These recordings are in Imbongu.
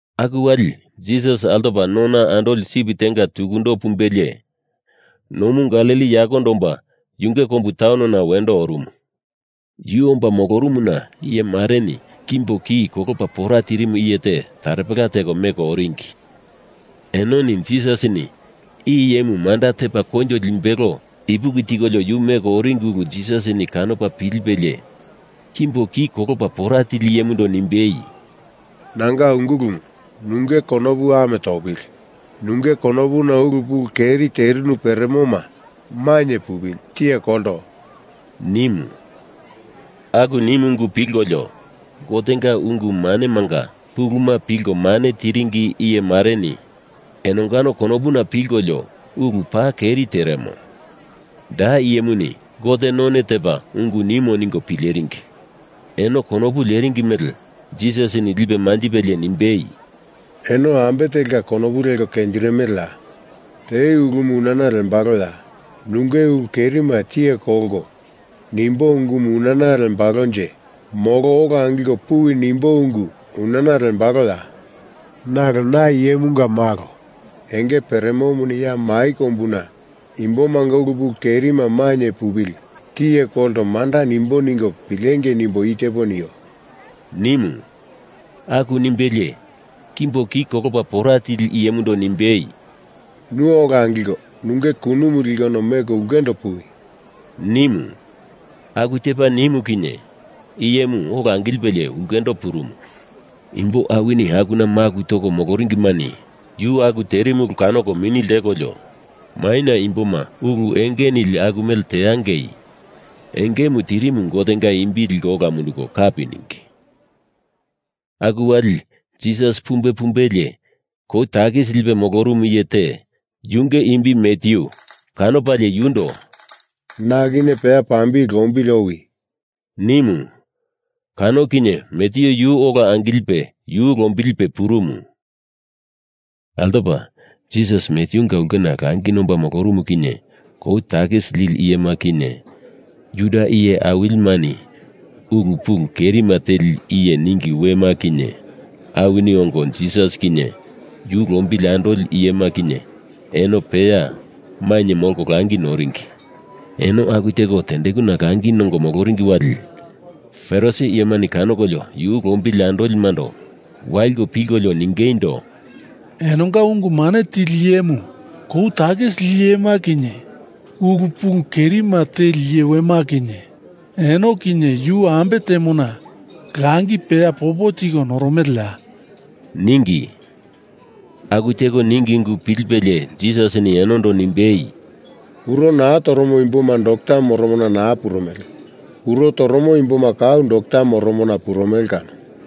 Aku wali Jisas altopa nona andoli sip tenga tukundo pumbelie, nomu Galili yakondo omba yunge kombu taunona wendo orumu. Yu omba molorumuna iye mareni kimbo ki kolopa pora tirimu iye te taropela teko meko oringi. Enoni Jisasini i iyemu manda tepa koinjo limbelo ipuki tikolio yu meko oringi ulu Jisasini kanopa pilipelie kimbo ki kolopa pora tili iyemundo nimbei, “Nanga ungulumu, nunge konopu ame topili. Nunge konopuna ulu pulu keri terinu peremoma mainye pupili, tiye kolto,” nimu. Aku nimu ungu pilkolio Gotenga ungu manemanga puluma pilko mane tiringi iye mareni enongano konopuna pilkolio, ulu paa keri teremo. Da iyemuni Gote none tepa ungu nimo ningo pileringi. Eno konopu leringi mele Jisasini lipe manjipelie nimbei, “Eno ambe telka konopu leko kenjirimeleya? Te ulumu unana lembaloya? Nunge ulu kerima tiye kolto nimbo ungumu unana lembalonje molo ola angilko puwi nimbo ungu unana lembaloya? Nalo na Iyemunga Malo enge peremomuni ya mai kombuna imbomanga ulu pulu kerima mainye pupili, tiye kolto manda nimbo ningo pilengei nimbo i tepo nio,” nimu. Aku nimbelie kimbo ki kolopa pora tili iyemundo nimbei, “Nu ola angilko nunge kunumu likono meko ulkendo puwi,” nimu. Aku tepa nimu kinye iyemu ola angilipe ulkendo purumu. Imbo awini akuna maku toko moloringimani yu aku terimu ulu kanoko mini ltekolio, maina imboma ulu enge nili aku mele teangei engemu tirimu Gotenga imbi liko ola munduko kapi ningi. Aku wali Jisas pumbe pumbelie, kou takisi lipe molorumu iye te, yunge imbi Matyu, kanopalie yundo “Na kinye peya pambili lombili owi,” nimu. Kano kinye Matyu yu ola angilipe yu lombilipe purumu. Altopa Jisas Matyunga ulkena langi nomba molorumu kinye kou takisi lili iyema kinye, Juda iye awilimani ulu pulu kerima teli iye ningi wema kinye awini ongo Jisas kinye yu lombili andoli iyema kinye eno peya mainye molko langi noringi. Eno aku teko tendekuna langi nongo moloringi wali Farisi iyemani kanokolio yu lombili andolimando waliko pilkolio ningeindo, “Enonga ungu mane tili iyemu kou takisi lili iyema kinye ulu pulu kerima teli iye wema kinye eno kinye yu ambe temona langi peya popo tiko noromeleya?” ningi. Aku teko ningi ungu pilipelie Jisasini enondo nimbei, “Kuro naa toromo imboma dokta moromona naa purumele. Kuro toromo imboma kau dokta moromona purumele kano.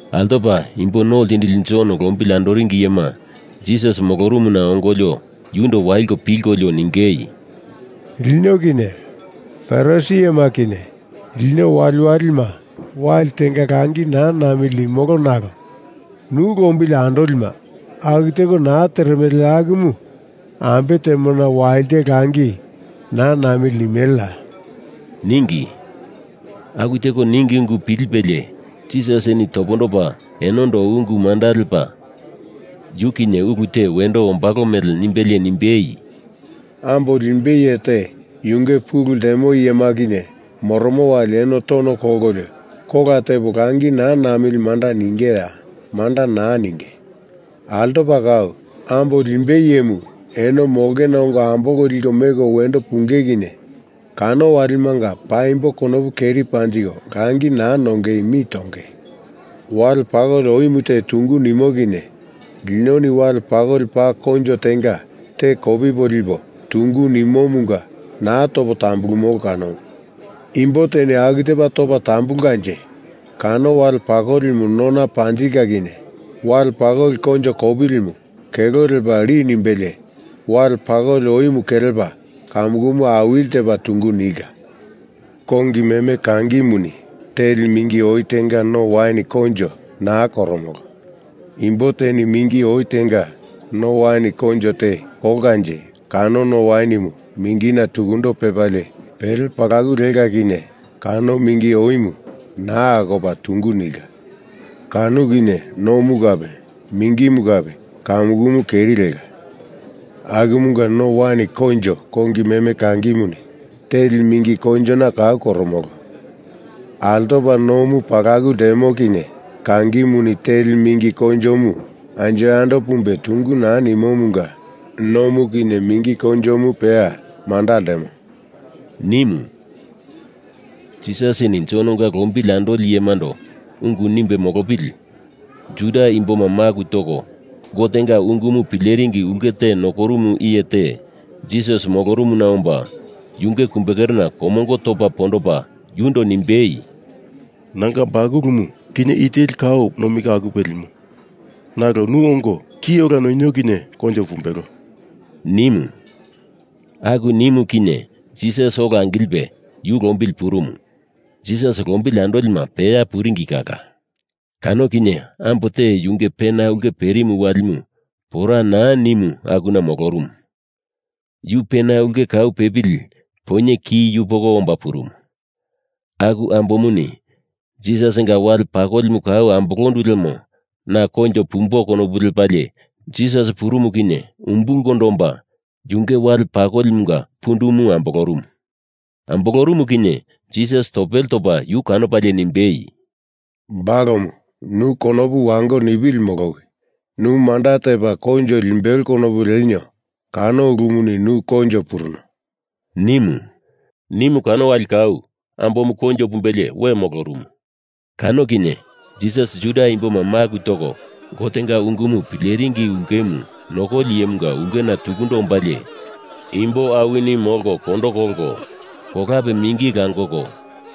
Altopa Imbo No Ltindili Jon lombili andoringi iyema Jisas molorumuna ongolio yundo waliko pilkolio ningei, “Lino kinye Farisi iyema kinye lino waliwalima wali tenga langi naa namili nimolo nalo nu lombili andolima aku teko naa teremele akumu ambe temona walite langi naa namili nimeleya?” ningi. Aku teko ningi ungu pilipelie Jisasini topondopa enondo ungu manda lepa yu kinye ulu te wendo ombalo mele nimbelie nimbei, “Ambo limbei iye te yunge pulu ltemo iyema kinye moromo wali eno tono kolkolio kola tepo langi naa namili manda ningeya? Manda naa ninge. Altopa kau, ambo limbei iyemu eno molongena ongo ambolko liko meko wendo punge kinye kano walimanga paimbo konopu keri panjiko langi naa nongei mi tonge. Wale pakoli oimu te tungu nimo kinye linoni wale pakoli paa koinjo tenga te kopipo lipo, tungu nimomunga naa topo tambulurumolo kanomu. Imbo teni aku tepa topa tambulkanje kano wale pakolimu nona panjilka kinye wale pakoli koinjo kopilimu kelo lepa li nimbelie wale pakoli oimu kelepa kamukumu awili tepa tungu nilka. Kongi meme kangimuni teli mingi oi tenga no wain koinjo naa koromolo. Imbo teni mingi oi tenga no wain koinjo te kolkanje kano no wainimu mingina tukundo pepalie pele palaku leka kinye kano mingi oimu naa akopa tungu nilka. Kano kinye nomu kape mingimu kape kamukumu keri leka. Akumunga no wain koinjo kongi meme kangimuni teli mingi koinjona kau koromolo. Altopa nomu palaku ltemo kinye kangimuni teli mingi koinjomu anjo yando pumbe tungu naa nimomunga nomu kinye mingi koinjomu peya manda ltemo,” nimu. Jisasini Jononga lombili andoli iyemando ungu nimbe molopili Juda imboma maku toko Gotenga ungumu pileringi ulke te nokorumu iye te Jisas molorumuna omba yunge kumbekerena komongo topa pondopa yundo nimbei, “Nanga bakulumu kinye i teli kau nomi ka akupe limo. Nalo nu ongo ki ola noinio kinye koinjo pumbelo,” nimu. Aku nimu kinye Jisas ola angilipe yu lombili purumu. Jisas lombili andolima peya puringi kala. Kano kinye ambo te yunge pena ulke perimu walima pora naa nimu akuna molorumu. Yu pena ulke kau pepili poinye ki yupoko omba purumu. Aku ambomuni Jisasinga wale pakolimu kau ambolondu lemo na koinjo pumbo konopu lepalie Jisas purumu kinye umbulkondo omba, yunge wale pakolimunga pundumu ambolorumu. Ambolorumu kinye Jisas topele topa yu kanopalie nimbei, “Balomu nu konopu wango nipili molowi. Nu manda tepa koinjo limbelo konopu lenio kano ulumuni nu koinjo puruno,” nimu. Nimu kano wali kau ambomu koinjo pumbelie we molorumu. Kano kinye Jisas Juda imboma maku toko Gotenga ungumu pileringi ulkemu nokoli iyemunga ulkena tukundo ombalie imbo awini molko kondo kolko, kolape mingi langoko,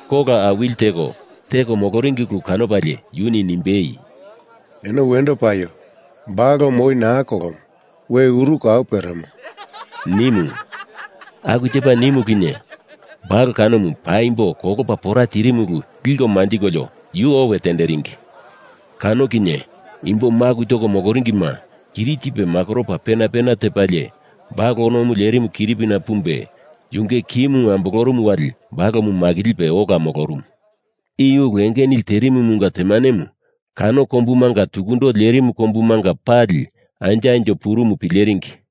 kola awili teko, teko moloringi ulu kanopalie yuni nimbei, “Eno wendo paio! Balomu oi naa kolomo. We uru kau peremo,” nimu. Aku tepa nimu kinye balo kanomu paimbo kolopa pora tirimu ulu liko manjikolio yu owe tenderingi. Kano kinye imbo maku toko moloringima kiri tipe makoropa pena pena tepalie balo onomu lerimu kiripina pumbe yunge kimu ambolorumu wali balomu makilipe ola molorumu. I ulu enge nili terimumunga temanemu kano kombumunga tukundo lerimu kombumanga pali anjo anjo purumu pileringi.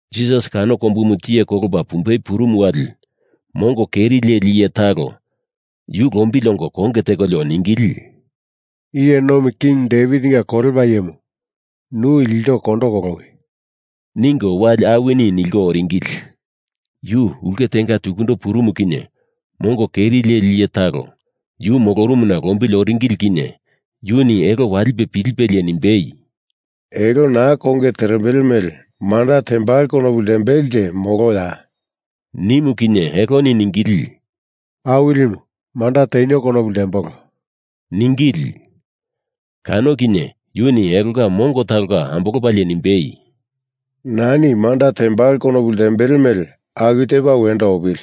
Jisas kano kombumu tiye kolopa pumbei purumu wali mongo keri leli iye talo yu lombili ongo konge tekolio ningili, “Iye nomi king Devitinga kolepa iyemu, nu ilto kondo kolowi,” ningo wali awini nilko oringili. Yu ulke tenga tukundo purumu kinye mongo keri leli iye talo yu molorumuna lombili oringili kinye yuni elo walipe pilipelie nimbei, “Elo na konge terembele mele manda tembalo konopu ltembelenje moloya?” nimu kinye eloni ningili, “Awilimu, manda tenio konopu ltembolo,” ningili. Kano kinye yuni elonga mongo talonga ambolopalie nimbei, “Nani manda tembalo konopu ltembele mele aku tepa wendo opili,”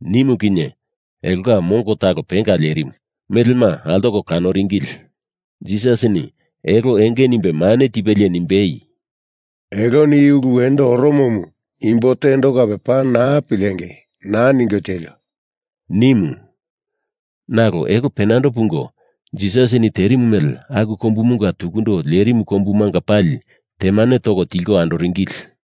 nimu kinye elonga mongo talo penga lerimu, melema altoko kanoringili. Jisasini elo enge nimbe mane tipelie nimbei, “Eloni i ulu wendo oromomu imbo tendo kape paa naa pilengei, naa ningo tielio!” nimu. Nalo elo penando pungo Jisasini terimu mele aku kombumunga tukundo lerimu kombumanga pali temane toko tilko andoringili.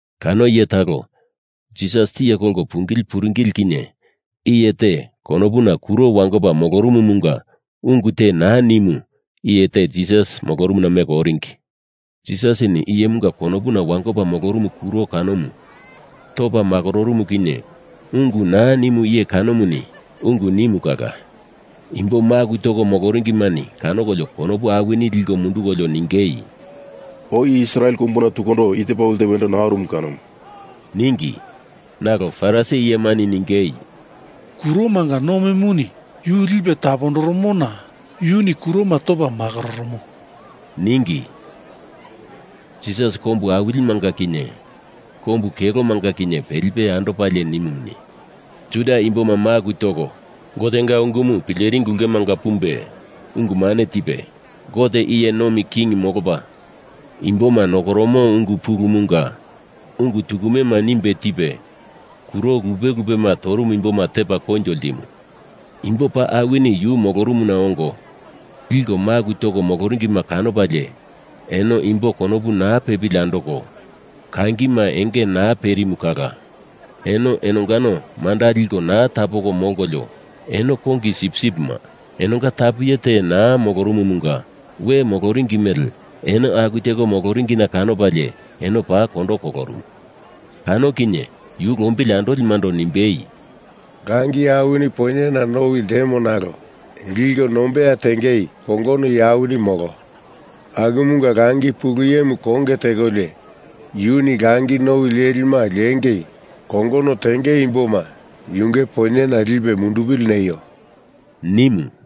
Kano iye talo Jisas tiye kolko pungili puringili kinye iye te konopuna kuro wangopa molorumumunga ungu te naa nimu iye te Jisas molorumuna meko oringi. Jisasini iyemunga konopuna wangopa molorumu kuro kanomu topa makororumu kinye ungu naa nimu iye kanomuni ungu nimu kala imbo maku toko moloringimani kanokolio konopu awini liko mundukolio ningei, “Oi Israel kombuna tukundo i tepa ulu te wendo naa orumu kanomu,” ningi. Nalo Farisi iyemani ningei, “Kuromanga nomimuni yu lipe tapondoromona yuni kuroma topa makororomo,” ningi. Jisas kombu awilimanga kinye, kombu kelomanga kinye pelipe andopalie nimumuni, Juda imboma maku toko Gotenga ungumu pileringi ulkemanga pumbe ungu mane tipe; Gote iye nomi king molopa imboma nokoromo ungu pulumunga ungu tukumema nimbe tipe kuro lupe lupema torumu imboma tepa koinjo ltimu. Imbo paa awini yu molorumuna ongo liko maku toko moloringima kanopalie eno imbo konopu naa pepili andoko, kangima enge naa perimu kala eno enongano manda liko naa tapoko molkolio eno kongi sipsipima enonga tapu iye te naa molorumumunga we moloringi mele eno aku teko moloringina kanopalie eno paa kondo kolorumu. Kano kinye yu lombili andolimando nimbei, “Langi awini poinyena nowi ltemo nalo liko nombeya tengei kongono iye awini molo. Akumunga Langi Pulu Iyemu konge tekolio yuni langi nowi lelima lingei kongono tenge imboma yunge poinyena lipe mundupili neio,” nimu.